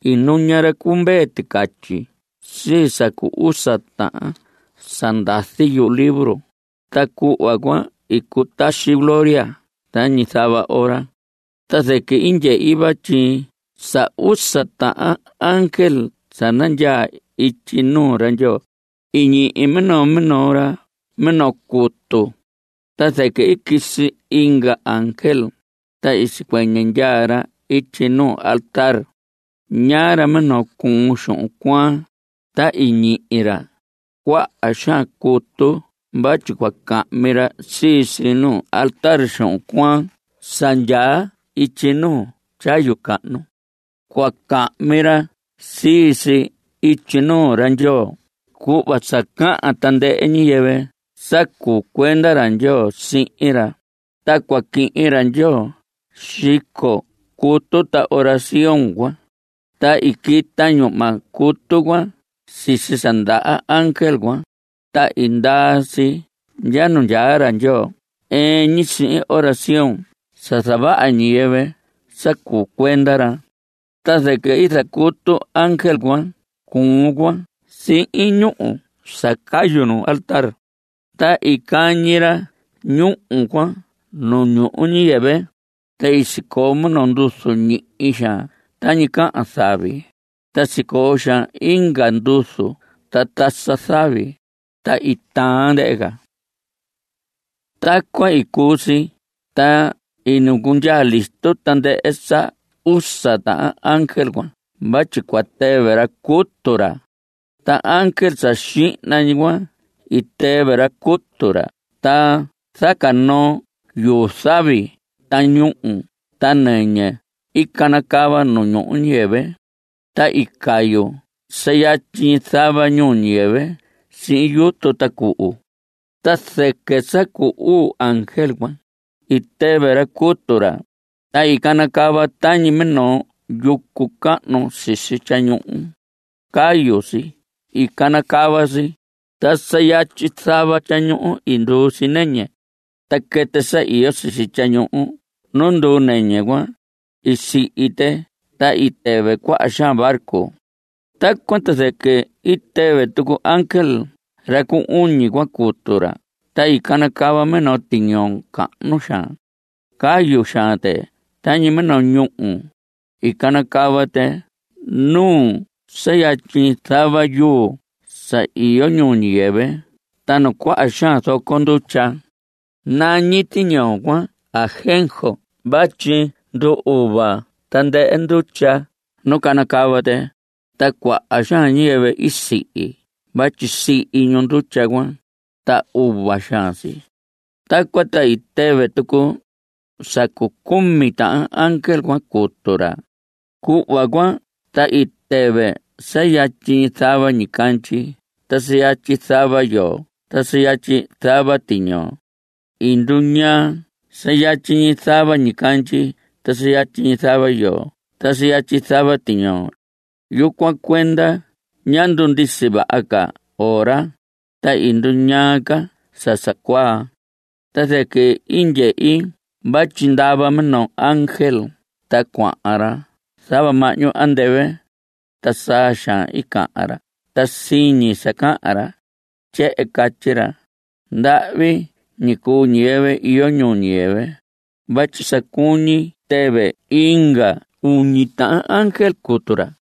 I nuña ra cu Mvee Ticatyi sii sa cu usa tahan sa ndazi yuhu libro, ta cuhva cuan i cutaxi gloria tañi zava ora. Ta zɨquɨ i ndyehi vatyi sa usa tahan ángel sa nandyaa ityi nuu ra Ndyoo, i ñihi minoo minoo ra minoo cutu. Ta zɨquɨ i quisi inga ángel, ta i sicuɨñɨ ndyaa ra ityi nuu altar. Ñaa ra minoo cuun xuhun cuaan. Ta i ñihi ra cuaha xaan cutu vatyi cua cahmi ra sii si nuu altar xuhun cuaan sa ndyaa ityi nuu tyayu cahnu. Cua cahmi ra sii si ityi nuu ra Ndyoo cuhva sa cahan tandɨhɨ ñiyɨvɨ sa cuu cuenda ra Ndyoo sihin ra. Ta cua quihin ra Ndyoo xico cutu ta oración cuan. Ta i quita ñuhma cutu cuan sisi sa ndaha ángel cuan, ta i ndaa si ndya nuu ra Ndyoo ɨɨn ñi sihin oración sa zavaha ñiyɨvɨ sa cuu cuenda ra. Ta zɨquɨ i zacutu ángel cuan cuun cuan sihin ñúhu sa cayu nu altar. Ta i cañi ra ñúhu cuan nu ñuhu ñiyɨvɨ. Ta sicoo minoo nduzu ñihi xaan tañi cahan zavi, ta sicoo xaan inga nduzu ta tasa zavi, ta i taan ndɨhɨ ca. Tacuan i cuu si, ta i nacundyaa listo tandɨhɨ sa usa tahan ángel cuan vatyi cua tɨvɨ ra cutu ra. Ta ángel sa xihna ñi cuan i tɨvɨ ra cutu ra, ta zaca noo yuu zavi ta ñúhu ta nɨñɨ i canacava nu ñuhu ñiyɨvɨ. Ta i cayu sa yatyi zava ñuu ñiyɨvɨ sihin yutu ta cuhu. Ta zɨquɨ sa cu uu ángel cuan, i tɨvɨ ra cutu ra, ta i canacava tañi minoo yucu cahnu sisi tyañuhu. Cayu si i canacava si. Ta sa yatyi zava tyañuhu i nduu si nɨñɨ. Ta quɨtɨ sa iyo sisi tyañuhu nu nduu nɨñɨ cuan, i sihi tɨ. Ta i tɨvɨ cuaha xaan barco. Tacuan ta zɨquɨ i tɨvɨ tucu ángel sa cu uñi cuan cutu ra ta i canacava minoo tiñoo cahnu xaan. Cayu xaan tɨ tañi minoo ñúhu. I canacava tɨ nuu sa yatyi zava yuu sa iyo ñuhu ñiyɨvɨ ta nu cuaha xaan zoco ndutya. Nañi tiñoo cuan Ajenjo vatyi ndu‑uva tandɨhɨ ndutya nu canacava tɨ, ta cuaha xaan ñiyɨvɨ i sihi vatyi sihi ñu ndutya cuan, ta uva xaan si. Tacuan ta i tɨvɨ tucu sa cu cumi tahan ángel cuan cutu ra. Cuhva cuan ta i tɨvɨ sa yatyi zava ñicandyi ta sa yatyi zava yoo ta sa yatyi zava tiñoo. I nduñaa sa yatyi zava ñicandyi ta sa yatyi zava yoo ta sa yatyi zava tiñoo. Yucuan cuenda ñá ndundisi vaha ca ora, ta i nduñaa ca sa sa cuaa. Ta zɨquɨ i ndyehi vatyi ndava minoo ángel ta cuahan ra zava mahñu andɨvɨ. Ta saa xaan i cahan ra ta siñi sa cahan ra. Tyehen catyi ra: ¡Ndahvi ñi cuu ñiyɨvɨ iyo ñuu ñiyɨvɨ!, vatyi sa cuñi tɨvɨ inga uñi tahan ángel cutu ra.